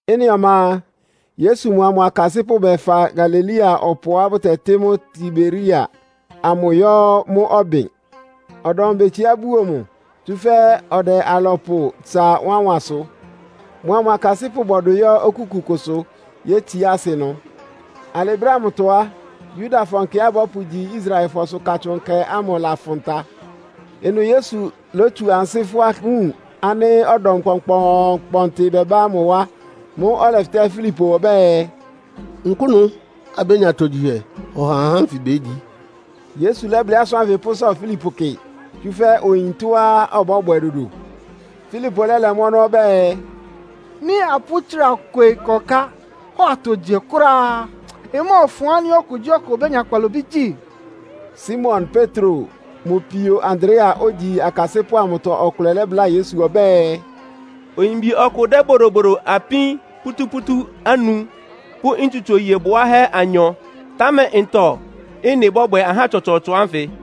Ɩ́nɩ ɔma a, Yesu mʋa mʋ akasɩ́pʋ́ bɛfa Galilea ɔpʋá bʋtɛtɩ́ mʋ́ Tiberia amʋ yɔ́ mʋ́ ɔbɩn. Ɔdɔm betsiá buo mʋ, tsúfɛ́ ɔdɛ alɔpʋ tsa wánwansʋ. Mʋa mʋ akasɩ́pʋ́ bɔdʋ yɔ́ okúku kʋsʋ, yétsiá asɩ ɩnʋ. (Alɩ brɛ́ ámʋtɔ á, Yudafɔ nkɛá bɔ́pʋgyi Israelfɔsʋ Katsʋn Nkɛ ámʋ ɩlafʋn ta.) Ɩnʋ Yesu lótsu ansɩ́ fʋ́á wun ánɩ́ ɔdɔm kpɔnkpɔɔnkpɔntɩ bɛbá mʋ wá. Mʋ́ʋ́ ɔlɛfɩtɛ́ Filipo ɔbɛ́ɛ, “Nkʋ́nʋ́ abénya atogyihɛ hɔ ha ahá ánfɩ bégyi?” (Yesu lɛ́blɩ́ asʋ́n ánfɩ pʋ́sɔ Filipo kɩ, tsúfɛ́ oyin tɔ́á ɔbɔ́bwɛ dodo.) Filipo lɛ́lɛ mʋ́ ɔnɔ́ ɔbɛ́ɛ, “Nɩ́ apʋ́ tsra kwe ɩkɔká hɔ atogyihɛ kʋ́ráá á, ɩmɔ́ɔfʋn ánɩ́ okugyíɔkʋ obénya kpalobí gyí!” Simon Petro mʋ pio Andrea, ogyi akasɩ́pʋ́ amʋtɔ ɔkʋlɛ lɛ́bláa Yesu ɔbɛ́ɛ, “Oyimbi ɔkʋ dɛ́ bodobodo apín pútúpútú anu pʋ́ ntsutso iye bwáhɛ́ anyɔ. Támɛ ntɔ ɩ́nɩ bɔ́bwɛ ahá tsɔtsɔɔtsɔ ánfɩ?”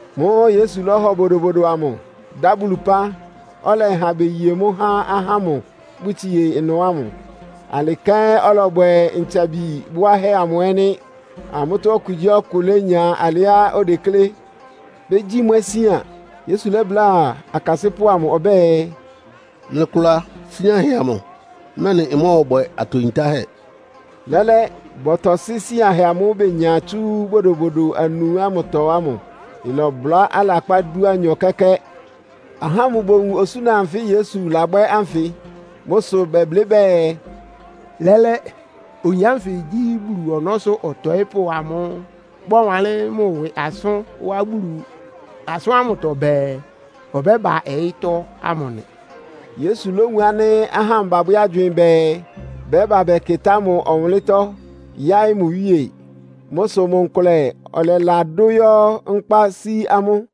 Mʋ́ʋ́ Yesu lɔ́hɔ bodobodo amʋ, dá Bulu ɩpán, ɔlɛha beye mʋ́ há ahá ámʋ́ʋ́ bʋtsie ɩnʋ ámʋ. Alɩ kɛ́n ɔlɔbwɛ ntsabi bʋáhɛ́ amʋ ɛ́ nɩ́. Amʋ́tɔ́ okugyíɔkʋ lénya alɩá odeklé. Begyi mwɛ sian. Yesu lɛ́bláa akasɩ́pʋ́ amʋ ɔbɛ́ɛ, “Mlɩkʋla síanhɛ amʋ, mɛ́nɩ ɩmɔ́ɔbwɛ atɔ yintáhɛ́.” Lɛ́lɛ́, bɔtɔsɩ́ síanhɛ amʋ́ʋ́ benya tsú bodobodo anu ámʋtɔ ámʋ. Ɩlɔbʋlá alakpá dúanyɔ kɛ́kɛ́. Ahá ámʋ bowun osúna anfɩ Yesu labwɛ́ ánfɩ. Mʋ́ sʋ bɛblɩ́ bɛɛ, “Lɛ́lɛ́, oyin ánfɩ gyí Bulu ɔnɔ́sʋ́ ɔtɔɩ́pʋ́ amʋ́ʋ́ bɔwanlɩ́n mʋ ɩwɩ asʋ́n wá Bulu asʋ́ntɔ́ bɛɛ, ɔbɛ́ba ɔyɩ́tɔ́ ámʋ nɩ́.” Yesu lówun ánɩ́ ahá ámʋ babwɛ́ agywɩɩn bɛɛ, bɛ́ba bɛkɩtá mʋ ɔwʋnlɩ́ntɔ́ yáɩ́ mʋ iwíe. Mʋ́ sʋ mʋ nkʋlɛ ɔlɛladʋ́ yɔ́ nkpá sí amʋ́.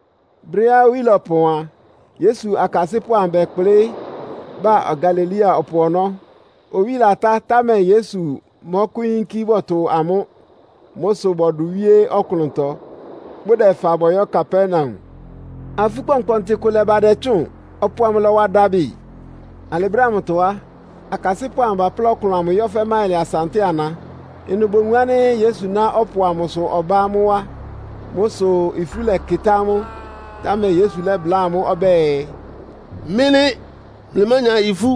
Brɛ́á owí lɔpɔn a, Yesu akasɩ́pʋ́ bɛkplɩ́ ba Galilea ɔpʋ ɔnɔ́. Owí latá, támɛ Yesu mɔ́kʋ́yínkí bɔtʋ amʋ́. Mʋ́ sʋ bɔdʋ wíé ɔklʋntɔ, bʋdɛfa bɔyɔ́ Kapernaum. Afú kpɔnkpɔntɩ kʋ lɛ́ba ɩdɛtsʋ́ʋn, ɔpʋ amʋ lɔ́wa dabɩ. Alɩ brɛ́ ámʋtɔ á, akasɩ́pʋ́ amʋ baplá ɔklʋn amʋ yɔ́ fɛ́ máɩlɩ asa ntɛ́ɛ ana. Ɩnʋ bowun ánɩ́ Yesu ná ɔpʋ amʋsʋ ɔbá amʋ́ wá. Mʋ́ sʋ ifú lɛkɩtá amʋ́. Támɛ Yesu lɛ́bláa amʋ́ ɔbɛ́ɛ, “Mɩ́ nɩ́, mlɩmánya ifú!”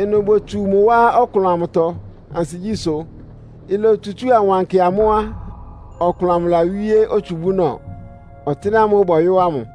Ɩnʋ botsu mʋ wá ɔklʋn amʋtɔ ansigyísʋ́. Ilotsutsúa ɩwankɩ amʋ́ á, ɔklʋn amʋ lawíé otsubúnɔ, ɔtɩ́nɛ́ amʋ́ʋ́ bɔyɔ́ ámʋ.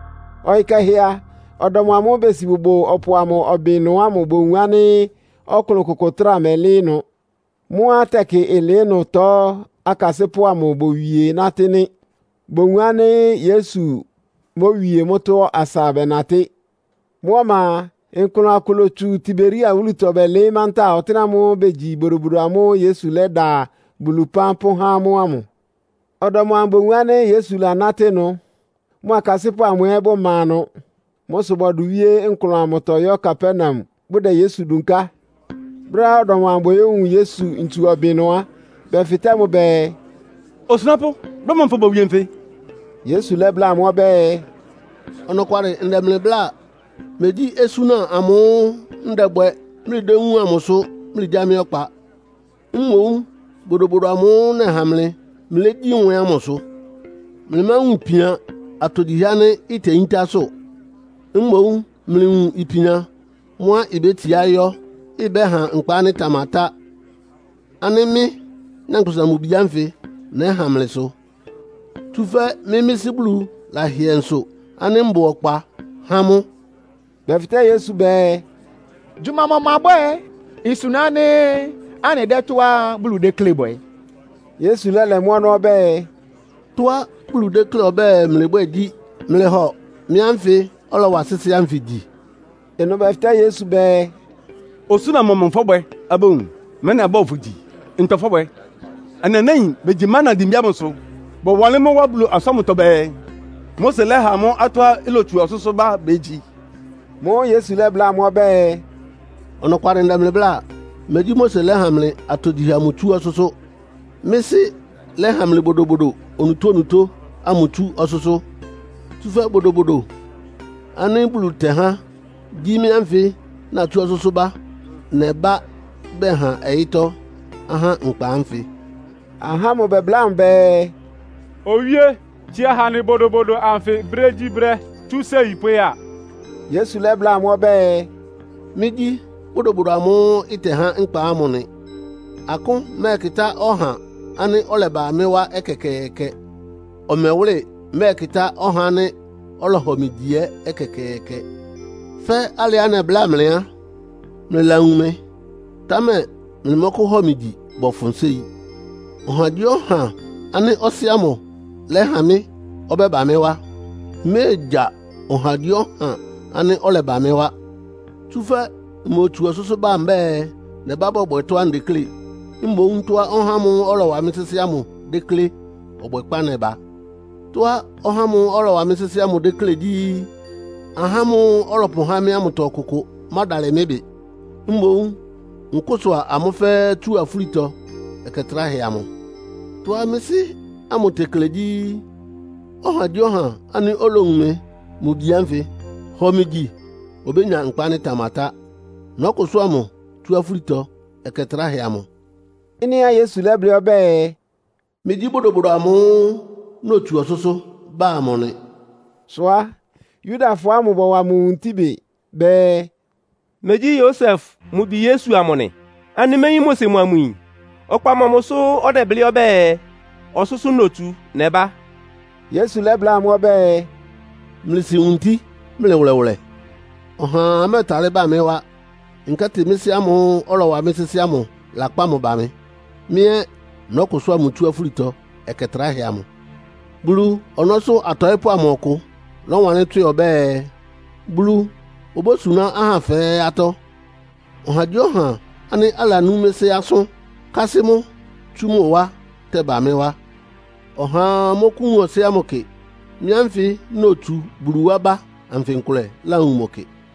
Ɔyɩ́ kɛhɛ a, ɔdɔm amʋ́ʋ́ besi bʋbʋ ɔpʋ amʋ ɔbɩn ɩnʋ ámʋ bowun ánɩ́ ɔklʋn kʋkʋ ɩtráa mɛlɩ́ɩ́ ɩnʋ. Mʋ́á tɛkɩ ɩlɩɩ́ ɩnʋtɔ akasɩ́pʋ́ amʋ bowie nátɩ́ nɩ́. Bowun ánɩ́ Yesu mówie mʋ́tɔ́ asa bɛnatɩ́. Mʋ́ ɔma a, nklʋn akʋ lótsu Tiberia wúlutɔ bɛlɩɩ́ mantáa ɔtɩ́nɛ́ ámʋ́ʋ́ begyi bodobodo amʋ́ʋ́ Yesu lɛ́da Bulu ɩpán pʋ́há amʋ́ ámʋ. Ɔdɔm amʋ bowun ánɩ́ Yesu lanátɩ́ ɩnʋ, mʋ akasɩ́pʋ́ amʋ ɛ́ bʋma ɩnʋ. Mʋ́ sʋ bɔdʋ wíé nklʋn amʋtɔ yɔ́ Kapernaum, bʋdɛ Yesu dunká. Brɛ́á ɔdɔm amʋ boyówun Yesu ntsu ɔbɩn ɩnʋ á, bɛfɩtɛ́ mʋ bɛɛ, “Osunápʋ́, brɛ́ mɔmʋ fobowie nfɩ?” Yesu lɛ́bláa amʋ́ ɔbɛ́ɛ, “Ɔnɔkwalɩ ndɛ mlɩ bláa. Megyí osúna amʋ́ʋ́ ndɛbwɛ mlɩdéwúun amʋ sʋ mlɩgyá mɩ́ ɔkpa. Mboún bodobodo amʋ́ʋ́ nɛha mlɩ, mlɩlégyí mwɛ ámʋ sʋ. Mlɩmáwun ipian atogyihɛ ánɩ́ iteyíntá sʋ. Mboún mlɩwun ipian mʋ́á ibétsiá yɔ́, ɩbɛ́ha nkpa ánɩ́ ɩtamatá, ánɩ́ mɩ́, Nyankpʋsa-Mʋ-Bi ánfɩ nɛ́ha mlɩ sʋ. Tsúfɛ́ mɩ́ mɩ́ Sɩ́ Bulu lahɩɛ nsʋ ánɩ́ mbʋ ɔkpa há mʋ́.” Bɛfɩtɛ́ Yesu bɛɛ, “Gyʋma mɔmʋ abwɛ́ɛ isuna ánɩ́ anɩdɛ́ tɔ́á Bulu tekle bwɛ?” Yesu lɛ́lɛ mʋ́ ɔnɔ́ ɔbɛ́ɛ, “Tɔ́á Bulu déklé ɔbɛ́ɛ mlɩbwɛ́ɛ gyí, mlɩhɔ mɩ́ ánfɩ ɔlɔwa sɩ́sɩ́ ánfɩ gyi.” Ɩnʋ bɛfɩtɛ́ Yesu bɛɛ, “Osúna mɔmʋ fɔ́bwɛ abówun, mɛ́nɩ abɔ́hɔ fʋ gyi? Ntɔ fɔ́bwɛ? Anɩ anáin begyi mana dimbí ámʋsʋ. Bɔwanlɩ́n mʋ́ wá Bulu asʋ́n ámʋtɔ bɛɛ, ‘Mose lɛ́ha amʋ́ atɔ́á ilotsu ɔsʋ́sʋ́ bá begyi.’” Mʋ́ʋ́ Yesu lɛ́bláa amʋ́ ɔbɛ́ɛ, “Ɔnɔkwalɩ ndɛ mlɩ bláa. Megyí Mose lɛ́ha mlɩ atogyihɛ amʋ tsú ɔsʋ́sʋ́. Mɩ́ Sɩ́ lɛ́ha mlɩ bodobodo onutónutó ámʋ tsú ɔsʋ́sʋ́. Tsúfɛ́ bodobodo ánɩ́ Bulu tɛhá gyí mɩ́ ánfɩ natsú ɔsʋ́sʋ́ bá, nɛbá bɛha ɔyɩ́tɔ́ ahá nkpa ánfɩ.” Ahá ámʋ bɛbláa mʋ bɛɛ, “Owíé, tsia ha anɩ bodobodo anfɩ brégyíbrɛ́, tsú séi pʋ́ya.” Yesu lɛ́bláa amʋ́ ɔbɛ́ɛ, “Mɩ́gyí bodobodo amʋ́ʋ́ ɩtɛhá nkpa ámʋ nɩ. Akʋ́n mɛ́ɛkɩtá ɔhá ánɩ́ ɔlɛba mɩ́ wá ɛkɛkɛɛkɛ. Ɔmɛwʋ́lɩ mɛ́ɛkɩtá ɔhá ánɩ́ ɔlɔhɔ mɩ gyi ɛ́ ɛkɛkɛɛkɛ. Fɛ́ alɩá nɛbláa mlɩ á, mlɩlawun mɩ, támɛ mlɩmɔ́kʋ́hɔ mɩ gyi bɔfʋn séi. Ɔhagyíɔha ánɩ́ Ɔsɩ́ ámʋ lɛ́ha mɩ́ ɔbɛ́ba mɩ́ wá. Mméegya ɔhagyíɔha ánɩ́ ɔlɛba mɩ́ wá. Tsúfɛ́ mmotsu ɔsʋ́sʋ́ ba mbɛ́ɛ, nɛbá bɔbwɛ tɔ́á ndeklé. Mboún tɔ́á ɔhá ámʋ́ʋ́ ɔlɔwa mɩ́ sɩ́sɩ́ ámʋ déklé ɔbwɛkpá nɛba. Tɔ́á ɔhá ámʋ́ʋ́ ɔlɔwa mɩ́ sɩ́sɩ́ ámʋ déklé gyí, ahá ámʋ́ʋ́ ɔlɔpʋhá mɩ́ ámʋtɔ ɔkʋkʋ mádalɩ mɩ́ ɩbɩ. Mboún nkʋ́sʋa amʋ́ fɛ́ɛ́ tsu afúlitɔ ɛkɛ tráhɛ amʋ. Tɔ́á mɩ́ Sɩ́ ámʋ tekle gyí, ɔhagyíɔha ánɩ́ olowun mɩ́, mʋ Bi ánfɩ, hɔ mɩ gyi obénya nkpa ánɩ́ ɩtamatá. Nɔ́kʋsʋ́a mʋ tsú afúlitɔ ɛkɛ tráhɛ amʋ.” Ɩ́nɩá Yesu lɛ́blɩ́ ɔbɛ́ɛ, “Mɩ́gyí bodobodo amʋ́ʋ́ notsu ɔsʋ́sʋ́ ba amʋ nɩ” sʋ á, Yudafɔ ámʋ bɔwa mʋ wuntí bɩ. Bɛɛ, “Megyí Yosef mʋ bi Yesu amʋ nɩ? Anɩméyín mʋ sɩ mʋa mʋ yin? Ɔkpa mɔmʋ sʋ́ ɔdɛblɩ́ ɔbɛ́ɛ, ‘Ɔsʋ́sʋ́ notsu nɛba?’” Yesu lɛ́bláa amʋ́ ɔbɛ́ɛ, “Mlɩsi wuntí mlɩ wʋlɛwʋlɛ. Ɔhaa mɛ́ɛtalɩ́ ba mɩ́ wá, nkɛ́tɩ mɩ́ Sɩ́ ámʋ́ʋ́ ɔlɔwa mɩ́ sɩ́sɩ́ ámʋ lakpá mʋ ba mɩ. Mɩ́ ɛ́ nɔ́kʋsʋ́a mʋ tsú afúlitɔ ɛkɛ tráhɛ amʋ. Bulu ɔnɔ́sʋ́ atɔɩ́pʋ́ amʋtɔ ɔkʋ lɔ́wanlɩ́n tswɩ ɔbɛ́ɛ, ‘Bulu obósuná ahá fɛ́ɛ́ atɔ́.’ Ɔhagyíɔha ánɩ́ alanú mɩ́ Sɩ́ asʋ́n, kásɩ́ mʋ́ tsú mʋ wá tɛba mɩ́ wá. Ɔhaa mɔ́kʋ́wun Ɔsɩ́ ámʋ kɩ. Mɩ́ ánfɩ notsu Bulu wá bá anfɩ nkʋlɛ láwun mʋ kɩ.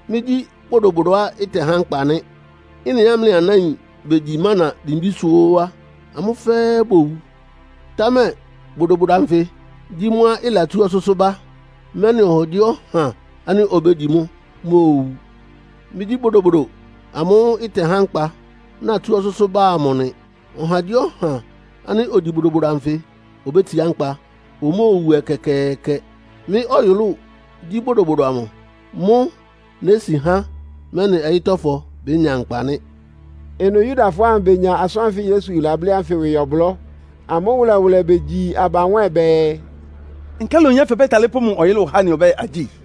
Mɩ́gyí bodobodoá ɩtɛhá nkpa nɩ́. Ɩ́nɩá mlɩ anáin begyi mana dimbísʋ́ óó á, amʋ́ fɛ́ɛ́ bowu. Támɛ bodobodo anfɩ gyí mʋ́a ɩlatsú ɔsʋ́sʋ́ bá, mɛ́nɩ ɔhagyíɔha ánɩ́ obégyi mʋ́ móowu nɩ́. Mɩ́gyí bodobodo amʋ́ʋ́ ntɛhá nkpa, natsú ɔsʋ́sʋ́ ba amʋ nɩ. Ɔhagyíɔha ánɩ́ ogyi bodobodo anfɩ obétsiá nkpa, omóowu ɛkɛkɛɛkɛ. Mɩ́ ɔyʋlʋ́ʋ gyí bodobodo amʋ. Mʋ́ nési há, mɛ́nɩ ɔyɩ́tɔ́fɔ bénya nkpa nɩ́.” Ɩnʋ Yudafɔ ámʋ benya asʋ́n anfɩ́ Yesu lablɩ́ ánfɩ ɩwɩ ɔblɔ́. Amʋ́ wʋlɛwʋlɛ begyi aba nwɛ́ɛn bɛɛ, “Nkálɩ oyin ánfɩ ɔbɛ́talɩ́ pʋ́ mʋ ɔyʋlʋ́ʋ há anɩ ɔbɛ́ɛ agyíi?”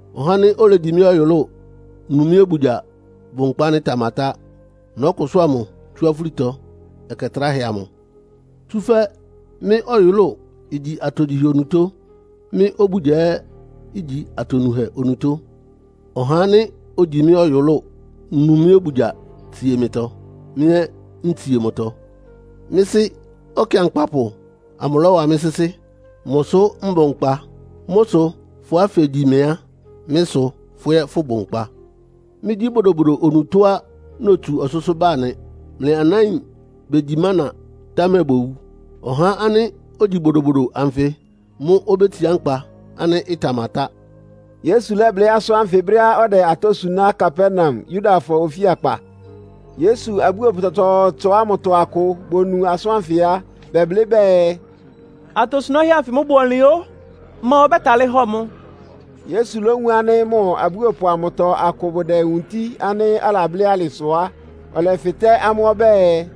Ɔhá ánɩ́ olegyi mɩ́ ɔyʋlʋ́ʋ, nu mɩ́ obugya bʋ nkpa ánɩ́ ɩtamatá. Nɔ́kʋsʋ́a mʋ tsú afúlitɔ ɛkɛ tráhɛ amʋ. Tsúfɛ́ mɩ́ ɔyʋlʋ́ʋ igyi atogyihɛ onutó, mɩ́ obugya ɛ́ igyi atonuhɛ onutó. Ɔhá ánɩ́ ogyi mɩ́ ɔyʋlʋ́ʋ, nu mɩ́ obugya tsie mɩtɔ, mɩ́ ɛ́ ntsie mʋtɔ. Mɩ́ Sɩ́ Ɔkɩankpapʋ amʋ lɔ́wa mɩ́ sɩ́sɩ́. Mʋ sʋ́ mbʋ nkpa. Mʋ́ sʋ fʋ́á fegyi mɩ a, mɩ́ sʋ fʋ́ ɛ́ fʋbʋ nkpa. Mɩ́gyí bodobodo onutóá notsu ɔsʋ́sʋ́ ba nɩ. Mlɩ anáin begyi mána, támɛ bowu. Ɔhá ánɩ́ ogyi bodobodo anfɩ mʋ́ obétsiá nkpa ánɩ́ ɩtamatá.” Yesu lɛ́blɩ́ asʋ́n ánfɩ brɛ́á ɔdɛ atɔ́ suná Kapernaum, Yudafɔ ofíakpa. Yesu abúopʋ tsɔtsɔɔtsɔ ámʋtɔ akʋ bonu asʋ́n ánfɩ á, bɛblɩ́ bɛɛ, “Atosunáhɛ́ ánfɩ mʋ́ bʋ ɔnlɩn o! Ma ɔbɛ́talɩ́ hɔ mʋ́?” Yesu lówun ánɩ́ mʋ abúopʋ amʋtɔ akʋ bʋdɛ wunti ánɩ́ alablɩ́ alɩ sʋ á, ɔlɛfɩtɛ́ amʋ́ ɔbɛ́ɛ,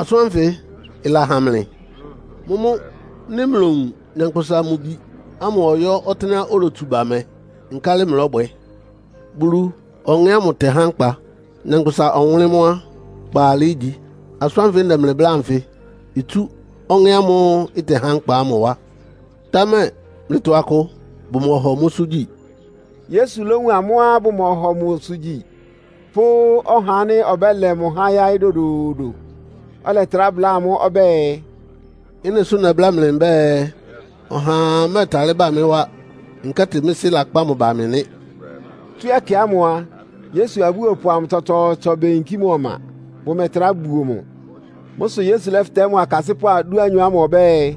“Asʋ́n ánfɩ ɩlahan mlɩ? Mʋ́mʋ́ nɩ́ mlowun Nyankpʋsa-Mʋ-Bi ámʋ ɔyɔ́ ɔtɩ́nɛ́á olotsu ba mɛ, nkálɩ mlɔ́bwɛ? Bulu Ɔŋɛ́ ámʋ tɛ́há nkpa. Nyankpʋsa ɔwʋnlɩ́n mʋ́ á, kpaalɩ ígyi. Asʋ́n ánfɩ ndɛ mlɩ bláa anfɩ itsú Ɔŋɛ́ ámʋ́ʋ́ ɔtɛhá nkpa ámʋ wá, támɛ mlɩtɔ akʋ bʋmɔhɔ mʋ́sʋ́ gyi.” Yesu lówun amʋ́á bʋmɔhɔ mʋ́sʋ́ gyi pʋ́ ɔhá ánɩ́ ɔbɛ́lɛ mʋ há yáɩ́ dodoodo. Ɔlɛtrá bláa amʋ́ ɔbɛ́ɛ, “Ɩ́nɩ sʋ́ nɛbláa mlɩ mbɛ́ɛ, ɔhaa mɛ́ɛtalɩ́ ba mɩ́ wá, nkɛ́tɩ mɩ́ Sɩ́ lakpá mʋ ba mɩ” nɩ́. Tsú ɛkɛ ámʋ a, Yesu abúopʋ amʋ tsɔtsɔɔtsɔ beyinkí mʋ ɔma, bʋmɛtrá buo mʋ. Mʋ́ sʋ Yesu lɛ́fɩtɛ́ mʋ akasɩ́pʋ́ dúanyɔ ámʋ ɔbɛ́ɛ,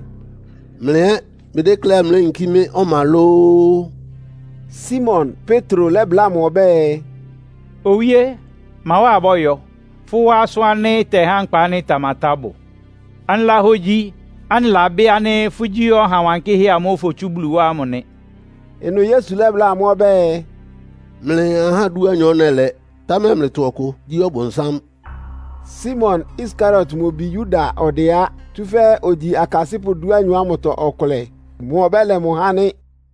“Mlɩ ɛ́ mlɩdékléá mléyinkí mɩ́ ɔma lóó?” Simon Petro lɛ́bláa mʋ ɔbɛ́ɛ, “Owíé, ma wá abɔ́yɔ? Fʋ́ wá asʋ́n ánɩ́ ɩtɛhá nkpá ánɩ́ ɩtamatá bʋ. Anɩlahogyi, anɩlabɩ́ ánɩ́ fʋ́gyí Ɔha Wankɩ́hɛ́ amʋ́ʋ́ fotsú Bulu wá ámʋ nɩ.” Ɩnʋ Yesu lɛ́bláa amʋ́ ɔbɛ́ɛ, “Mlɩ ahá dúanyɔ nɛlɛ, támɛ mlɩtɔ ɔkʋ gyí ɔbʋnsám!” (Simon Iskariot mʋ bi Yuda ɔdɛ á. Tsúfɛ́ ogyi akasɩ́pʋ́ dúanyɔ ámʋtɔ ɔkʋlɛ. Mʋ ɔbɛ́lɛ mʋ há nɩ́.)